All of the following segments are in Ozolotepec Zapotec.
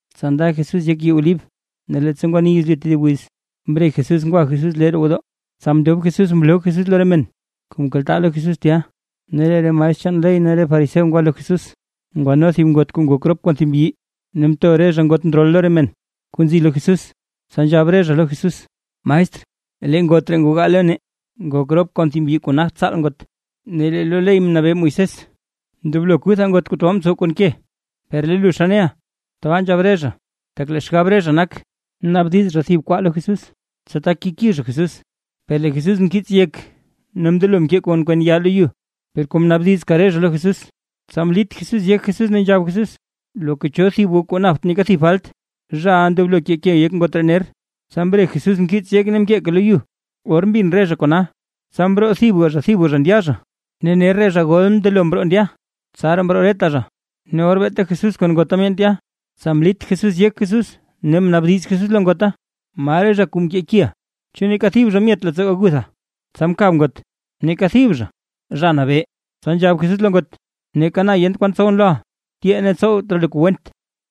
Tsa nda Jesús yek yii Olib, ne leettsa ngwani yezlyu tedib wiz, mre Jesús ngwa Jesús lee roo gwodoo. Tsa mndob Jesús mloo Jesús lo re men kuu mkaltaa lo Jesús tya. Ne lee re maestr chaan ley ne re fariseo ngwa lo Jesús, ngwano thib ngot kuu ngok rop kon thib mbyi. Ne mto re zha ngot ndrol lo re men kuu nzi lo Jesús, tsa nzhab re zha lo Jesús: ―Maestr, lee ngot ree ngogaa lo nee, ngok rop kon thib mbyi kuu nagt tsaal ngot. Ne lee lo ley mnabee Moisés, ndoblo kuthaa ngot kuu tabaa ntsow kon ke. ¿Per lee lu xa neʼa? Tata nzhab re zha, tak lee xgab re zha nak, naabdiz zha thib kwaa lo Jesús, tsa tak keki zha Jesús. Per lee Jesús mkiits yek ne mndelo mkee kon kwen yaa lo yu. Per kom naabdizka re zha lo Jesús, tsa mlit yek Jesús ne nzhab Jesús: ―Loka cho thib goo kuu napt neeka thib falt, zhaʼa ndoblo kee ke yek ngot ree ner. Tsa mre Jesús mkiits yek ne mkeeka lo yu. Or mbin re zha kona, tsa mroo thibga thibga zha ndya zha, ne ner re zha gol mndelo mroo ndya, tsaraa mroo reta zha. Ne or beeta Jesús kon ngota myaan tya, tsa mlit Jesús yek Jesús ne mnaabdiz Jesús lo ngota: ―¿Ma re zha kuu mkekiʼa? ¿Chu neeka thib zha myet leettsoo gagutha? Tsa mkab ngot: ―Neeka thib zha, Zha Nabee. Tsa nzhab Jesús lo ngot: ―Neeka na yent kwan tsowʼn loʼa, tyee ne tsowt raa lu kuu went.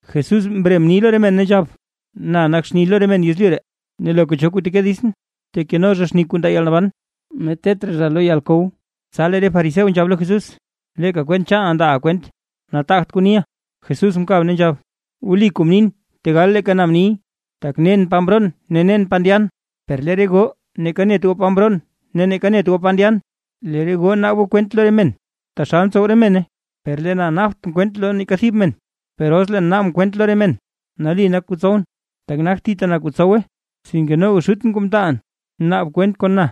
Jesús mre mni lo re men, ne nzhab: ―Na nak xni lo re men yezlyu ree, ne loka cho kuu teke ditsʼn, tekeno zha xni kuu ndaa yalnaban, ne tet raa lo yalkow. Tsa lee re fariseo nzhab lo Jesús: ―Leeka kwent chaana ndaaʼa kwent, nataagt kuu niʼa. Jesús mkab ne nzhab: ―Wli kuu mnin tegal leeka na mniy. Tak nen pa mroon ne pa ndyan, per lee re goo neeka net goo pa mroon ne neeka net goo pa ndyan. Lee re goo naab goo kwent lo re men taxal ntsow re mene, per lee na naabt kwent lo neeka thib men, per os leen naabʼn kwent lo re men, nali nak kuu tsowʼn, tak nagt thita na kuu tsowe, sinke noga Xutʼn kuu mtaalʼn naab kwent kon na.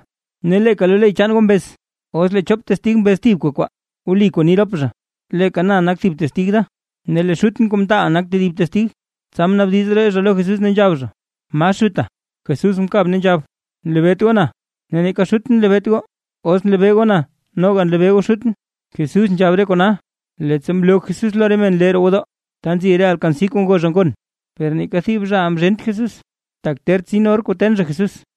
Ne leeka lo ley chaan goo mbez: Os lee chop testig mbez thibka kwaa, wli kuu ni rop zha. Leeka na nak thib testig da, ne lee Xutʼn kuu mtaalʼn nak tedib testig. Tsa mnaabdiz re zha lo Jesús, ne nzhab zha: ―¿Ma Xuta? Jesús mkab ne nzhab: ―Nlebeet goo na, ne neeka Xutʼn nlebeet goo, os nlebee goo na noga nlebee goo Xutʼn. Jesús nzhab re kona, leettsa mloo Jesús lo re men lee roo gwodoo, ta nzib re alkansi kuu ngo zha gon. Per neeka thib zha mzhent Jesús, tak ter tsin or kuu ten zha Jesús.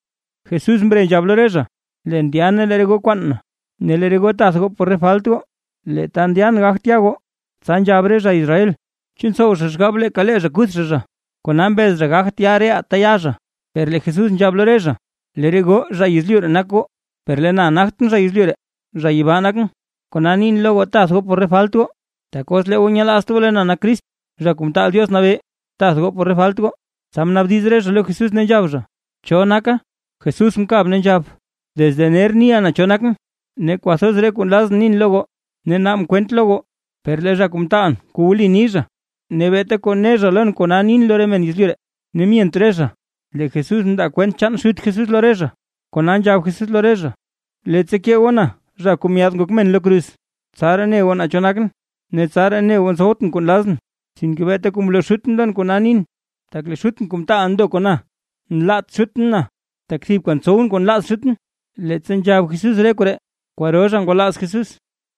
Jesús mre nzhab lo re zha: ―Leen ndya ne lee re goo kwaan na, ne lee re goo tath goo por re falt goo, lee ta ndyan gagt ya goo. Tsa nzhab re zha Israel: ―¿Chu ntsow zha xgab leeka lee zha kuth zha zha, kona mbez zha gagt ya reʼaa ta ya zha? Per lee Jesús nzhab lo re zha: ―Lee re goo zha yezlyu ree nak goo, per lee na nagtʼn zha yezlyu ree, zha yibaa nakʼn. Kona nin lo goo, tath goo por re falt goo, tak os lee goo nyelaazt goo lee na nak Crist, Zha Kuu Mtaal Diox Nabee, tath goo por re falt goo. Tsa mnaabdiz re zha lo Jesús ne nzhab zha: ―¿Cho naka? Jesús mkab ne nzhab: ―Desde ner niʼa naa cho nakʼn. Ne kwathoz re kuu nlazʼn nin lo goo ne naabʼn kwent lo goo, per lee zha kuu mtaalʼn kuu wli ni zha, ne beeta kuu ne zha lon kona nin lo re men yezlyu ree. Per myent re zha lee Jesús mndaa kwent chaan Xut Jesús lo re zha. Kona nzhab Jesús lo re zha: ―Leettsa kee goo na zha kuu Myaad Ngok Men lo kruz, tsaraa ne goo naa cho nakʼn, ne tsaraa ne goo ntsowtʼn kuu nlazʼn, sinke beeta kuu mloo Xutʼn lon kona nin. Tak lee Xutʼn kuu mtaalʼn ndo kon na; nlaat Xutʼn na, tak thibka ntsowʼn kuu nlaaz Xutʼn. Leettsa nzhab Jesús re koree, kwaro zha ngwalaaz Jesús.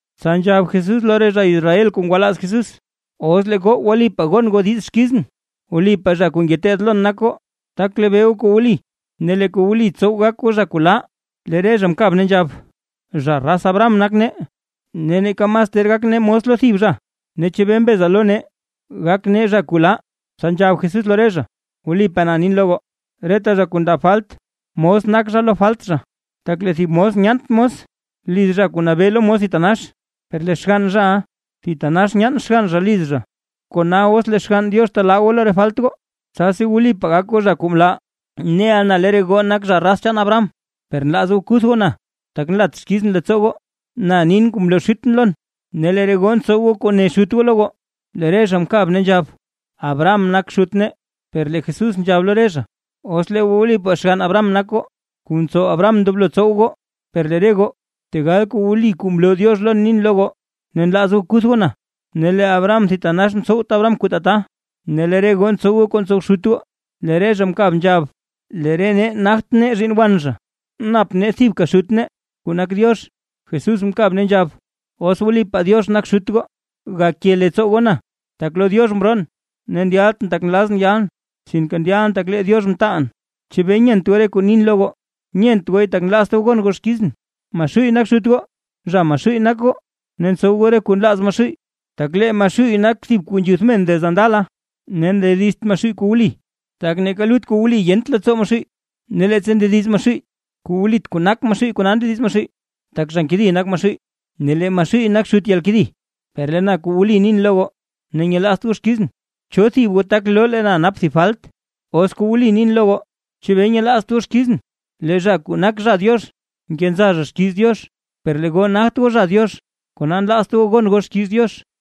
Tsa nzhab Jesús lo re zha Israel kuu ngwalaaz Jesús: ―Os lee goo wlipaa gon goo diiz xkizʼn, wlipaa zha kuu ngeteed lon nak goo, tak lebee goo kuu wli, ne lee kuu wli tsow gak goo zha kuu laa. Lee re zha mkab ne nzhab: ―Zha raz Abraham nak nee, ne neeka mas ter gak nee mos lo thib zha, ne ¿chebee mbeza lo nee, gak nee zha kuu laa? Tsa nzhab Jesús lo re zha: ―Wlipaa na nin lo goo, reta zha kuu ndaa falt mos nak zha lo falt zha. Tak lee thib mos nyaant mos liz zha kuu nabee lo mos thitanax, per lee xgann zhaʼa thitanax nyaan xgann zha liz zha. Kona os lee Xgann Diox telaa goo lo re falt goo, tsasi wlipaa gak goo zha kuu mlaa. Neʼa na lee re goo nak zha raz chaan Abraham, per nlaaz goo kuth goo na, tak nlat xkizʼn leettsoo goo. Na nin kuu mloo Xutʼn lon, ne lee re goo ntsow goo kuu ne xut goo lo goo. Lee re zha mkab ne nzhab: ―¡Abraham nak xut nee! Per lee Jesús nzhab lo re zha: ―Os lee goo wlipaa xgann Abraham nak goo, kuu mtsow Abraham ndoblo goo tsow goo. Per lee re goo, tegal kuu wli kuu mloo Diox lon mnin lo goo, ne nlaaz goo kuth goo na. ¡Ne lee Abraham thitanax mtsowt Abraham kuu tata! Lee re goo ntsow goo kuu ntsow xut goo. Lee re zha mkab nzhab: ―¡Lee re nee nagt nee zhiinn wan zha, nap nee thibka xut nee, kuu nak Diox! Jesús mkab ne nzhab: ―Os wlipaa Diox nak xut goo, gake leettsoo goo na, tak lo Diox mroon, ne ndyaltʼn tak nlazʼn yalʼn, sinke ndyalʼn tak lee Diox mtaalʼn. ¿Chebee nyent goo re kuu nin lo goo? Nyent gooy, tak nlaazt goo gon goo xkizʼn. Maxuuy nak xut goo, zha Maxuuy nak goo, ne ntsow goo re kuu nlaaz Maxuuy. Tak lee Maxuuy nak thib zha kuu nzhuth men desde ndala. Ne ndedizt Maxuuy kuu wli, tak neeka lut kuu wli yent leettsoo Maxuuy. Ne leettsa ndediz Maxuuy kuu wlit kuu nak Maxuuy kona ndediz Maxuuy, tak zha nkedi nak Maxuuy, ne lee Maxuuy nak xut yalkedi. Per lee na kuu wli nin lo goo ne nyelaazt goo xkizʼn. ¿Cho thib goo, tak loo goo lee na nap thib falt? Os kuu wli nin lo goo, ¿chebee nyelaazt goo xkizʼn? Lee zha kuu nak zha Diox, nkenza zha xkiiz Diox, per lee goo nagt goo zha Diox, kona nlaazt goo gon goo xkiiz Diox.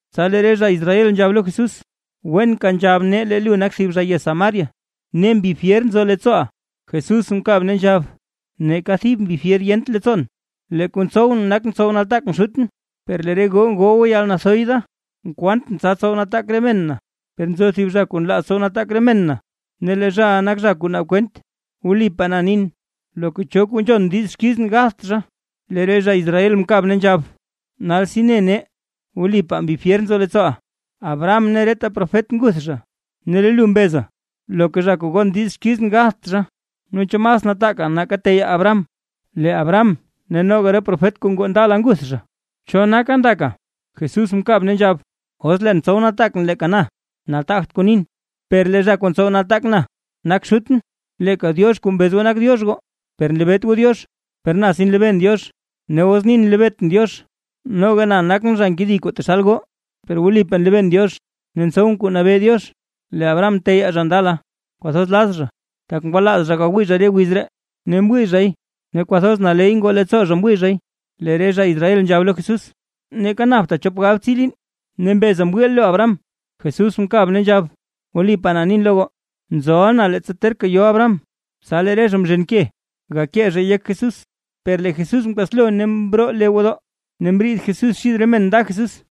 Tsa lee re zha Israel nzhab lo Jesús: ―Wenka nzhab nee lee lu nak thib zha yez Samaria, ne mbi fyer nzo leettsooʼa. Jesús mkab ne nzhab: ―Neeka thib mbi fyer yent leettsoon. Lee kuu ntsowʼn nak ntsow nataak na Xutʼn; per lee re goo ngoo goo yalnathoy da. Nkwaantʼn tsa tsow nataak re men na, per nzo thib zha kuu nlaaz tsow nataak re men na, ne lee zhaʼa nak zha kuu naab kwent. Wlipaa na nin, loka cho kuu nzhon diiz xkizʼn gatht zha. Lee re zha Israel mkab ne nzhab: ―Nalsi ne nee, wlipaa mbi fyer nzo leettsooʼa, Abraham ne reta profet nguth zha, ne lee lu mbeza: “Loka zha kuu gon diiz xkizʼn gatht zha”. Naa ¿chu mas nataaka nake teyaa Abraham? Lee Abraham, ne noga re profet kuu ngoo ndala nguth re zha. ¿Cho naka ndaka? Jesús mkab ne nzhab: ―Os leen tsow nataak na leeka na, nataagt kuu nin. Per lee zha kuu ntsow nataak na nak Xutʼn, leeka Diox kuu mbez goo nak Diox goo. Per nlebeet goo Diox. Per na si nlebeen Diox. Ne os nin nlebeetʼn Diox, noga na nakʼn zha nkedi taxal goo. Per wlipaa nlebeen Diox, ne ntsowʼn kuu nabee Diox. Lee Abraham teyaa zha ndala, kwathoz laz zha, tak ngwalaaz zha gawii zha wiz ree, ne mwii zhay ne kwathoz naley ngoo leettsoo zha mwii zhay. Lee re zha Israel nzhab lo Jesús: ―¡Neeka napta chop galbtsii liin, ne mbeza mwiiʼa lu Abraham! Jesús mkab ne nzhab: ―¡Wlipaa na nin lo goo, nzoʼa na leettsa terka yo Abraham! Tsa lee re zha mzhen ke, gakee zha yek Jesús, per lee Jesús mkaslo ne mroo lee roo gwodoo, ne mriid Jesús xid re men nda Jesús.